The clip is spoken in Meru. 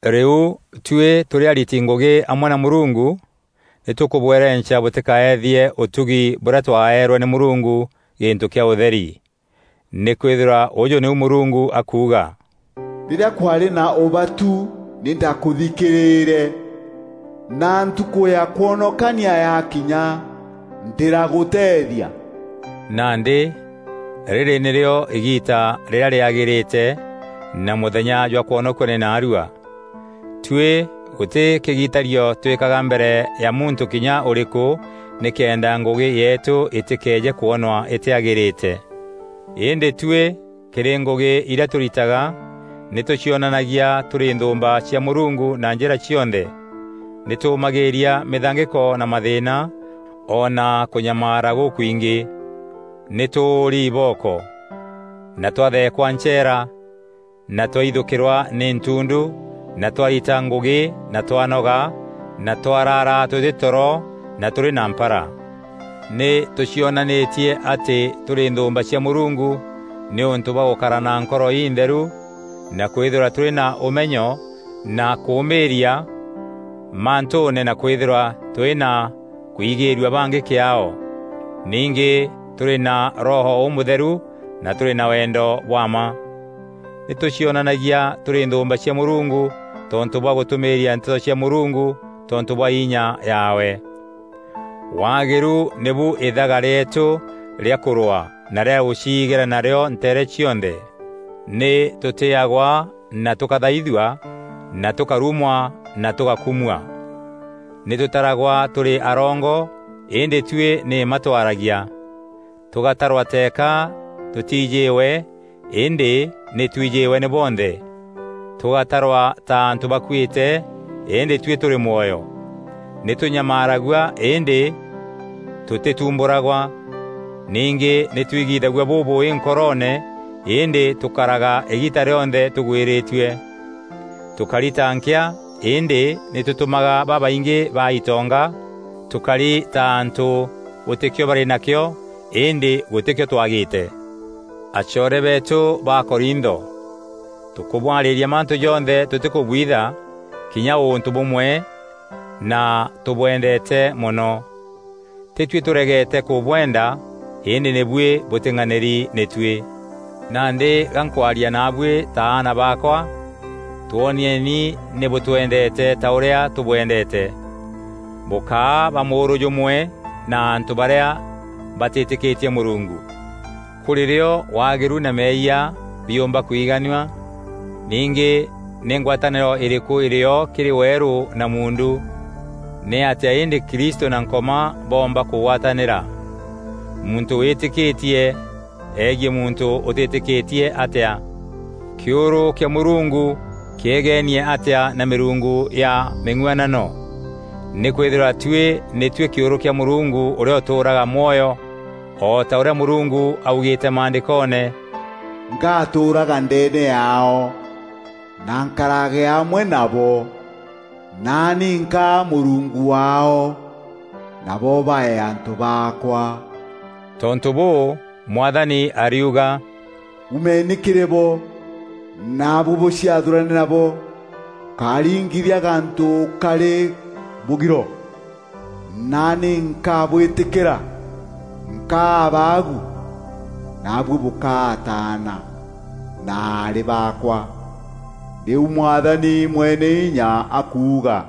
Rîu tuî tûrî ariti ngûgî amwe na Mûrungu, nî tûkûbwerenca bûtîkaeethie ûtugi bûrîa twaeerwe nî Mûrungu gîntû kîa ûtheri. Nîkwîthîrwa ûjû nîu Mûrungu akuuga, “Rîrîa kwaarî na ûbatu nî ndakûthikîrîîre, na ntukû ya kwonokania yakinya ndîragûteethia.” Nandî rîrî nîrîo îgîîta rîrîa rîagîrîte, na mûthenya jwa kwonokua nî naarua. Tuî gûtî kîgitario twîkaga mbere ya muntû kinya ûrîkû, nîkenda ngûgî yeetû îtîkeeje kwonwa îtîagîrîte. Îndî tuî kîrî ngûgî irîa tûritaga, nî tûcionanagia tûrî nthûûmba cia Mûrungu na njîra cionthe; nî tûûmagîîria mîthangîko na mathîîna o na kûnyamaara gûkwingî. Nî tûûri ibooko na twatheekwa ncheera na twaithûkîrwa nî ntundu na twarita ngûgî na twanoga na twaraara tûtî toro na tûrî na mpara. Nî tûcionanîtie atî tûrî nthûûmba cia Mûrungu nîûntû bwa gûkara na nkoro intheru na kwîthîrwa tûrî na ûmenyo na kûûmîîria mantûûne na kwîthîrwa tûrî na kwîgîîrua bangî kîaao. Ningî tûrî na Roho Ûmûtheru na tûrî na wendo bwa mma. Nî tûcionanagia tûrî nthûûmba cia Mûrungu tontû bwa gûtûmîîria Nteto cia Mûrungu tontû bwa inya yaawe. Waagîru nîbu îthaga rîeetû rîa kûrwaa na rîa gûciigîra narîo nteere cionthe. Nî tûtîîagwa na tûkathaithua, na tûkarumwa na tûgakumua. Nî tûtaragwa tûrî arongo, îndî tuî nî mma twaragia; tûgatarwa teeka tûtiijîîwe îndî nî twijîîwe nî bonthe; tûgatarwa ta antû bakuîte îndî tuî tûrî mwoyo. Nî tûnyamaaragua îndî tûtîtumbûragwa. Ningî nî twigithagua bûbûûî nkoroone îndî tûkaraga îgiita rîonthe tûgwîrîtue; tûkari ta nkîa îndî nî tûtûmaga babaingî baa itonga; tûkari ta antû gûtîkîo barî nakîo îndî gûtîkîo twagîte. Acoore beetû ba Korintho, tûkûbwarîria mantû jonthe tûtîkûbwitha kinya ûntû bûmwe na tûbwendeete mono. Tîtuî tûregete kûbwenda îndî nî buî bûtîng'anîri nî tuî. Nandî ga nkwaria naabuî ta aana baakwa: twoonieni nî bûtwendeete ta ûrîa tûbwendeete. Bûkáa ba mûûrû jûmwe na antû barîa batîtîkîtie Mûrungu. Kûrî rîo waagîru na meeyia biûmba kwiganua? Ningî nî ngwatanîro îrîkû îrîo kîrî weerû na muundu? Nîatîa îndî Kristû na Nkoma boomba kûgwatanîra? Muntû wîtîkîtie egiî muntû ûtîtîkîtie atîa? Kîûrû kîa Mûrungu kîegeenie atîa na mîrungu ya mîng'uanano? Nîkwîthîrwa tuî nî tuî kîûrû kîa Mûrungu ûrîa ûtûûraga mwoyo. O ta ûrîa Mûrungu augîîte Maandîkoone: “Ngatûûraga ndeene yaao, na nkarage amwe nabo. Naani nkaa Mûrungu waao, nabo bae antû baakwa.” Tontû bûû, Mwathani ariuga: “Umeeni kîrî bo, naabuî bûciathûrane nabo. Bûkáringithia gantû karî mûgiro, naani nkabwîtîkîra. Nkaa Abaagu, naabuî bûkaa ataana na aarî baakwa, nîu Mwathani Mweneinya akuuga.”